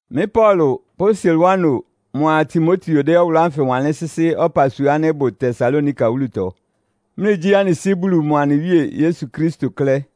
Mɩ́ Paulo pʋ́ Silwano mʋa Timoteo dɛ́ ɔwʋlʋ́ ánfɩ wanlɩ́n sɩ́sɩ́ ɔpasua ánɩ́ ɩbʋ Tesalonika wúlutɔ, mlɩgyí anɩ Sɩ́ Bulu mʋa anɩ Wíe Yesu Kristo klɛ́.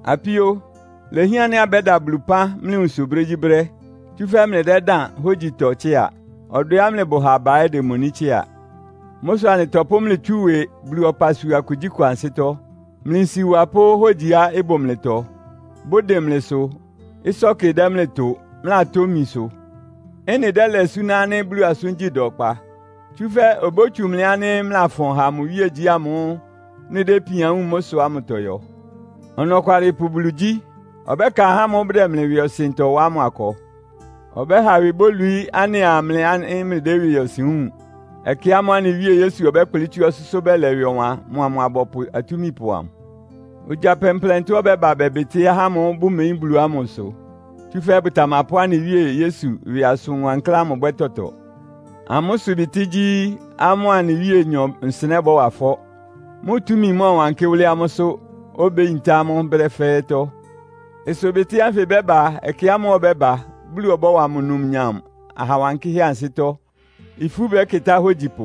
Apíó, ilehián ánɩ́ abɛ́da Bulu ɩpán mlɩ nwunsʋ brégyíbrɛ́. Tsúfɛ́ mlɩdɛ́dáan hógyitɔ tsɩ́a. Ɔdwɛá mlɩbʋ ha aba ɛ́ demoní tsɩ́a. Mʋ́ sʋ anɩtɔpʋ́ mlɩ tsú ɩwɩ Bulu ɔpasua kugyíkʋ ansɩ́tɔ́; mlɩ nsiwa pʋ́ hógyiá ɩbʋ mlɩtɔ, bʋdɩn mlɩsʋ, ɩsɔ́kɩ dɛ́ mlɩ tʋ, mlɩlatomi sʋ. Ɩ́nɩ dɛ́lɛ súná ánɩ́ Bulu asʋ́ngyí da ɔkpa. Tsúfɛ́ obótsu mlɩ ánɩ́ mlɩlafʋn ha mʋ iwíegyí ámʋ́ʋ́ mlɩdɛ́ ipian wúun mʋ́ sʋ ámʋtɔ yɔ. Ɔnɔkwalɩpʋ Bulu gyí. Ɔbɛ́ka ahá ámʋ́ʋ́ bʋdɛ mlɩ ɩwɩɔsɩntɔ wa ámʋ akɔ. Ɔbɛ́ha ɩwɩ bólwií anɩa mlɩ ánɩ́ mlɩdɛ́ ɩwɩɔsɩn wúun, ɛkɛ ámʋ́ʋ́ anɩ Wíe Yesu ɔbɛ́kplɩ́ tsú ɔsʋ́sʋ́ bɛlɛ ɩwɩ ɔwan mʋa mʋ abɔpʋ atúmipʋ amʋ. Ogya plɛnplɛntɔ ɔbɛ́ba bɛbɩtɩ́ ahá ámʋ́ʋ́ bʋmeyín Bulu ámʋ ɩsʋ. Tsúfɛ́ bʋtamapʋ́ anɩ Wíe Yesu ɩwɩ asʋn wankláán ámʋ bwɛ́ tɔtɔ. Amʋ́ ɩsʋbɩtɩ́ gyí, amʋ́a anɩ Wíenyɔ nsɩnɛ́ bɔ́wa ɩfɔ́, mʋ túmi mɔ́ɔwankɩ́ wʋ́lɩ́ amʋ́sʋ́, obéyintá amʋ́ brɛ́ fɛ́ɛ́tɔ́. Ɩsʋbɩtɩ́ ánfɩ ɩbɛ́ba ɛkɛ ámʋ́ʋ́ ɔbɛ́ba, Bulu ɔbɔ́wa mʋ numnyam aha wankɩ́hɛ́ ansɩ́tɔ́. Ifú bɛ́kɩtá ahógyipʋ.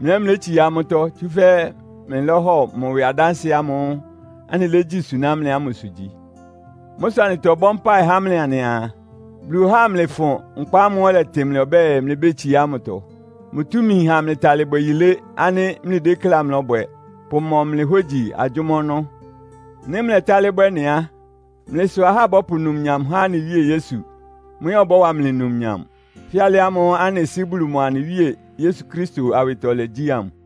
Mlɩ ɛ́ mlétsiá amʋ́tɔ́, tsúfɛ́ mlɩlɔ́hɔ mʋ ɩwɩ adánsɩɛ ámʋ́ʋ́ anɩlégyí suná mlɩ ámʋsʋ gyi. Mʋ́ sʋ anɩtɔbɔ́ mpáɩ há mlɩ anɩaa, Bulu ɔhá amlɩfʋn nkpa ámʋ́ʋ́ ɔlɛtɩ mlɩ ɔbɛ́ɛ, mlɩbétsiá ámʋtɔ. Mʋ túmi ɩháa amlɩtalɩ bwɛ yilé ánɩ́ mlɩdékléá mlɔ́bwɛ, pʋmɔ mlɩ hógyi agyʋ́má ɔnɔ́. Nɩ́ mlɛtálɩ́ bwɛ́ ɩ́nɩ á, mlɩ sʋ ahá bɔ́pʋ numnyam há anɩ Wíe Yesu, mʋ ɛ́ ɔbɔ́wa mlɩ numnyam; fɛ́ alɩ ámʋ́ʋ́ anɩ Sɩ́ Bulu mʋa anɩ Wíe Yesu Kristo awɩtɔlɛ gyí ámʋ.